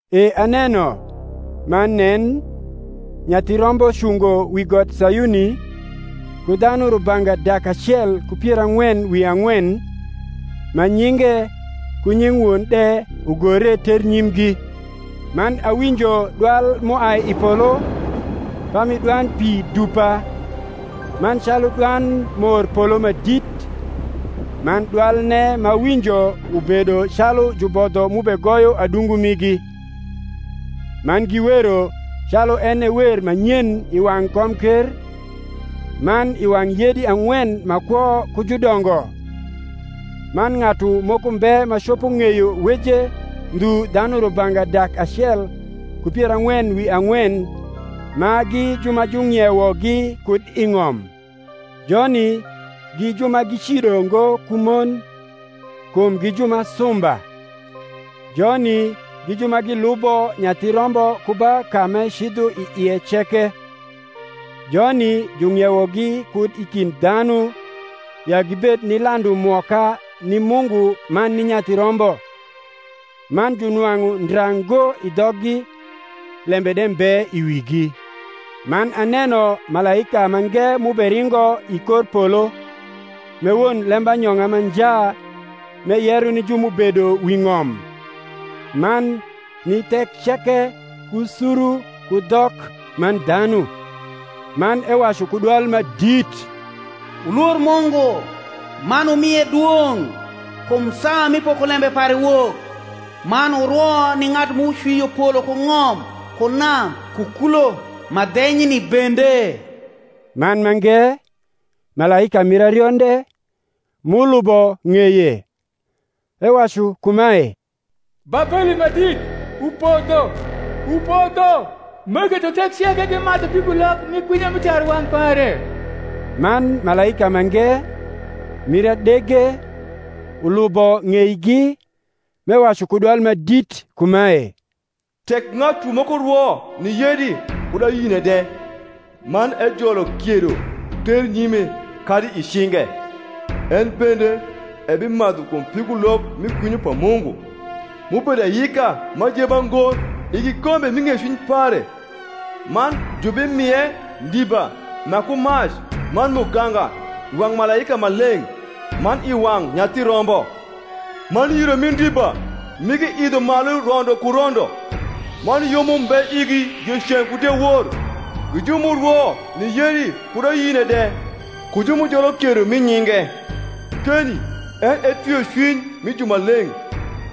E aneno, man nen, Nyathi Rombo cungo wi got Sayuni, ku dhanu rubanga dak acel ku pier ang’wen wi ang’wen, ma nyinge, ku nying Won de, ugore ternyimgi. Man awinjo dwal m’uai i polo, pami dwand pi dupa, man calu dwand morpolo ma dit: man dwalne m’awinjo ubedo calu jubodho m’ubegoyo adungu migi: man giwero calu en e wer ma nyen i wang’ komker, man i wang’ yedi ang’wen ma kwo ku judongo: man ng’atu moko mbe ma copo ng’eyo weje ndhu dhanu rubanga dak acel ku pier ang’wen wi ang’wen, ma gi ju ma jung’iewogi kud i ng’om. Joni gi ju ma gicido ngo ku mon; kum gi ju ma sumba. Joni gi ju ma gilubo Nyathi Rombo ku ba ka m’ecidho i ie ceke. Joni jung’iewogi kud i kind dhanu, ya gibed ni landu mwoka ni Mungu man ni Nyathi Rombo. Man junwang’u ndra ngo i dhoggi: lembe de mbe i wigi. Man aneno malaika mange m’uberingo i kor polo, m’e won lembanyong’a ma nja m’eyero ni ju m’ubedo wi ng’om, man ni thek ceke ku suru ku dhok man dhanu; man ewacu ku dwal ma dit, Wulwor Mungu, man wumie dwong’: kum saa mi pokolembe pare wok: man wurwo ni ng’atu m’ucwio polo ku ng’om ku nam ku kulo ma dhenyni bende. Man mange, malaika mir arionde, m’ulubo ng’eye, ewacu kumae, Babeli ma dit, upodho, upodho m’eketho thek ceke gimadhu pigulok mi kwinyo mi tarwang’ pare. Man malaika mange, mir adege, ulubo ng’eigi, m’ewacu ku dwal ma dit kumae, Tek ng’atu moko rwo ni yedi kud ayine de, man ejolo kiedo ternyime kadi i cinge, en bende ebimadhu kum pigulok mi kwinyo pa Mungu, m’ubedo ayika m’ajeba ngo i kikombe mi ng’ecwiny pare; man jubimie ndiba ma ku mac man muganga i wang’ malaika maleng’, man i wang’ Nyathi Rombo: man yiro mi ndiba migi idho malu rondo ku rondo; man yom umbe igi dieceng’ ku diewor, gi ju m’urwo ni yedi kud ayine de, ku ju m’ujolo kiedo mi nyinge. Keni en e twiocwiny mi jumaleng’,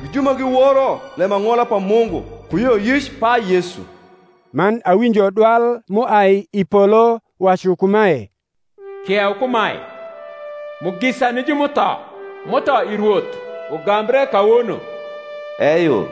gi ju ma giworo lembang’ola pa Mungu, ku yioyic pa Yesu. Man awinjo dwal m’uai i polo wacu kumae, Kieu kumae, Mugisa ni ju m’utho m’utho i Rwoth ugambre kawono: eyo,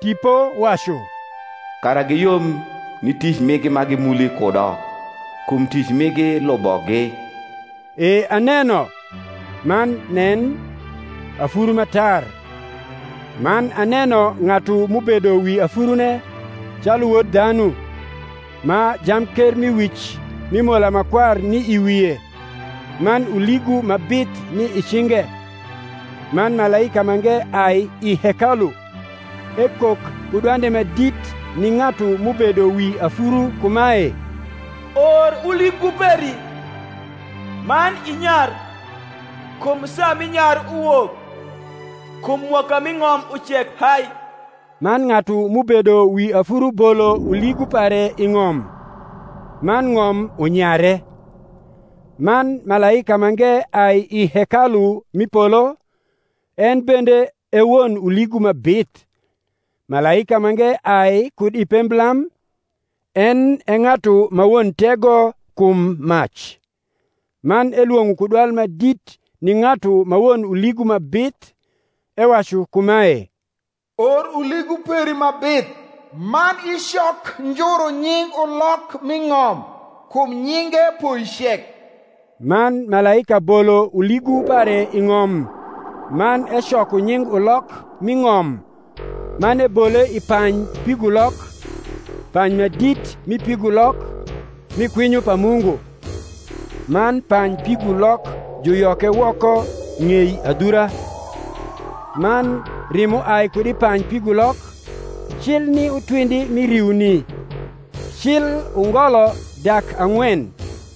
Tipo wacu, kara giyom ni tic migi ma gimuli kudo; kum tic migi lubogi. E aneno, man nen, afuru ma tar; man aneno ng’atu m’ubedo wi afurune calu wod dhanu, ma jamkermiwic mi mola ma kwar ni i wie, man uligu ma bith ni i cinge. Man malaika mange ai i hekalu, ekok ku dwande ma dit ni ng’atu m’ubedo wi afuru kumae, Or uligu peri, man inyar: kum saa mi nyar uwok; kum mwoka mi ng’om ucek hai. Man ng’atu m’ubedo wi afuru bolo uligu pare i ng’om; man ng’om unyare. Man malaika mange ai i hekalu m’i polo, en bende e won uligu ma bith. Malaika mange ai kud i pemblam, en e ng’atu ma won tego kum mac; man elwong’o ku dwal ma dit ni ng’atu ma won uligu ma bith, ewacu kumae, Or uligu peri ma bith, man icok njuru nying ulok m’i ng’om; kum nyinge poicek. Man malaika bolo uligu pare i ng’om, man ecoko nying ulok m’i ng’om, man ebole i pany pigulok, pany ma dit mi pigulok, mi kwinyo pa Mungu. Man pany pigulok juyoke woko ng’ei adhura, man rimo ai kud i pany pigulok, cil ni utwindi mi riuni, cil ungolo dak ang’wen.